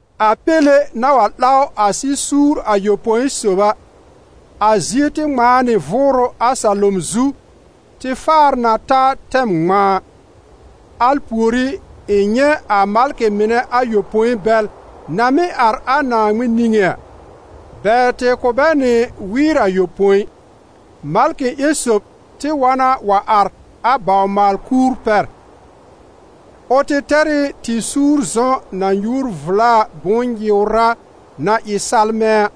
A Péle na wa 'law a sɩ-suur ayopõi sob a, a zie tɩ ŋmãa nɩ vʋʋrʋ a salom zu tɩ faar na ta tɛm ŋmãa. Al pùorí ɩ̃ nyɛ̃ a malkɩ mɩnɛ ayopõi bɛl na mɩ́ àr a Naaŋmɩn niŋé a; bɛ tɩ kʋ̀ bɛ nɩ wɩɩr ayopõi. Malkɩ ƴẽn sob tɩ wa na wa àr a bawr-maal-kuur pɛr; ʋ tɩ tɛr ɩ tɩ-suur zɔ̃ na nyuur vla a bʋ̃-nyɩ̀wrá na ɩ salmɛ̃ a.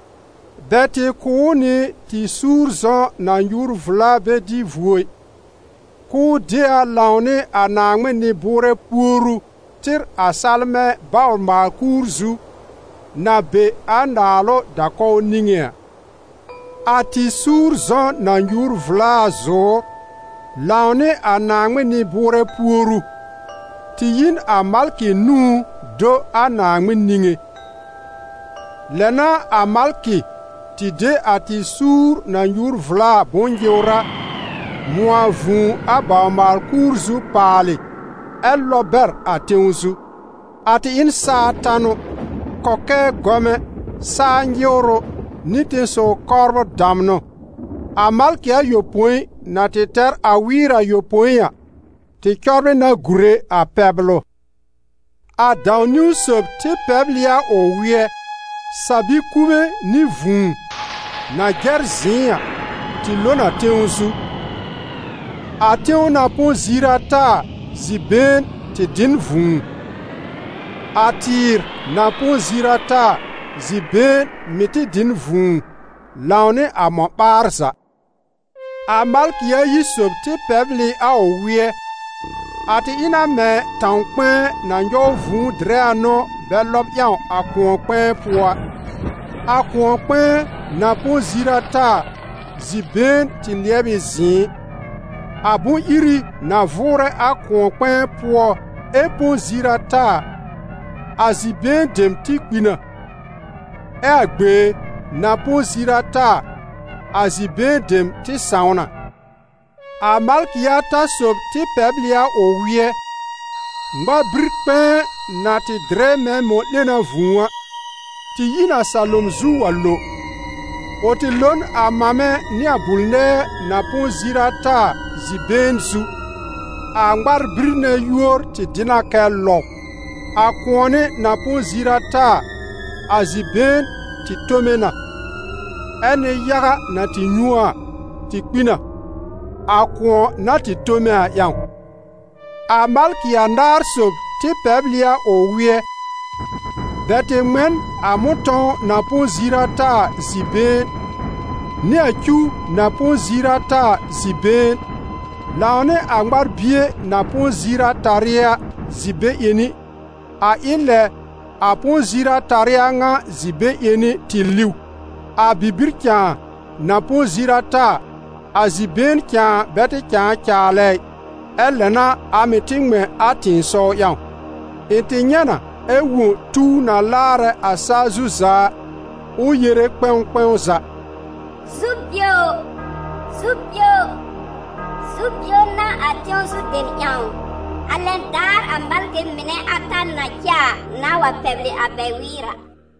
Bɛ tɩ kʋ̀ ʋ nɩ tɩ-suur zɔ̃ na nyuur vla a bɛ dɩ vuo ɩ, k'ʋʋ de a lãwnɩ a Naaŋmɩn nɩ-bʋʋrɛ puoru tɩr a salmɛ̃ bawr-maal-kuur zu, na be a naalʋ da-kɔw niŋé a. A tɩ-suur zɔ̃ na nyuur vla a zʋ̀ʋ́r, lãwnɩ a Naaŋmɩn nɩ-bʋʋrɛ puoru, tɩ yi n a malkɩ nũú do a Naaŋmɩn niŋé. Lɛ n'a a malkɩ tɩ de a tɩ-suur na nyuur vla a bʋ̃-nyɩ̀wrá, mʋ̃ɔ a vũu a bawr-maal-kuur zu paalɩ ɛ lɔb bɛr a tẽw zu. A tɩ ɩ n saa tanʋ, kɔkɛɛ gɔmɛ, saa nyɩwrʋ nɩ tẽsɔw kɔbr damnʋ. A malkɩ ayopõi na tɩ tɛr a wɩɩr a ayopõi a, tɩ cɔbrɩ na gùre a pɛblʋ. A dãw-niwn sob tɩ pɛbl ɩ a ʋ wɩ́ɛ; sa-bi-kube nɩ vũu, na jɛr zɩ̃ɩ a, tɩ lo n a tẽw zu. A tẽw na põ ziir ata a, zi-been tɩ dɩ n vũu; a tɩɩr na põ ziir ata a, zi-been mɩ̀ tɩ dɩ n vũu, lãwnɩ a mɔ̃-ɓaar za. A malkɩ ayi sob tɩ pɛbl ɩ a ʋ wɩ́ɛ; a tɩ ɩ na mɛ̃ tãw-kpɛ̃ɛ na nyɔw vũu dɩrɛ a n'ʋ bɛ lɔb ƴãw a kʋ̃ɔ-kpɛ̃ɛ pʋɔ a. A kʋ̃ɔ-kpɛ̃ɛ, na põ ziir ata a, zi-been tɩ lɩɛb ɩ zɩ̃ɩ. A bʋ̃-iri na vʋʋrɛ a kʋ̃ɔ-kpɛ̃ɛ pʋɔ ɛ põ ziir ata a, a zi-been dem tɩ kpi na, ɛ a gbee na põ ziir ata a, a zi-been dem tɩ sãw na. A malkɩ ata sob tɩ pɛbl ɩ a ʋ wɩ́ɛ; ŋmar-bir-kpɛ̃ɛ, na tɩ dɩrɛ mɛ̃ mɔ̃-'lena vũu a, tɩ yi n a salom zu wa lo. Ʋ tɩ lo n a mamɛ nɩ a bul-nɛɛ, na põ ziir ata a, zi-been zu. A ŋmar-bir nɛ yúor dɩ na kɛ Lɔw. A kʋ̃ɔnɩ na põ ziir ata a, a zi-been tɩ tome na, ɛ́ nɩ-yaga na tɩ nyũ a a, tɩ kpi na, a kʋ̃ɔ na tɩ tome a ƴãw. A malkɩ anaar sob tɩ pɛbl ɩ a ʋ wɩ́ɛ; bɛ tɩ ŋmɛ n a mʋ̃tɔ̃w na põ ziir ata a zi-been, nɩ a cuw na põ ziir ata a zi-been, lãwnɩ a ŋmar-bie na põ ziir atarɩ a zi-be-ƴẽni, a ɩ lɛ a põ ziir-atarɩ a ŋa zi-be-ƴẽni tɩ liw; a bibir cãa, na põ ziir ata a, a zi-been cãa bɛ tɩ cãa caalɛ ɩ, ɛ lɛ n'a a mɩ̀ tɩ ŋmɛ̃ a tɩ̃ɩsɔw ƴãw. Ɩ̃ tɩ nyɛ̃ na ɛ wõ tuw na laarɛ a saa zu za a, ʋ yere kpɛ̃w kpɛ̃w za: «Zu-bio! Zu-bio! Zu-bio n'a a tẽw zu dem ƴãw, a lɛn daar a malkɩ mɩnɛ ata na cɛ a nãà wa pɛblɩ a bɛ wɩɩr a!»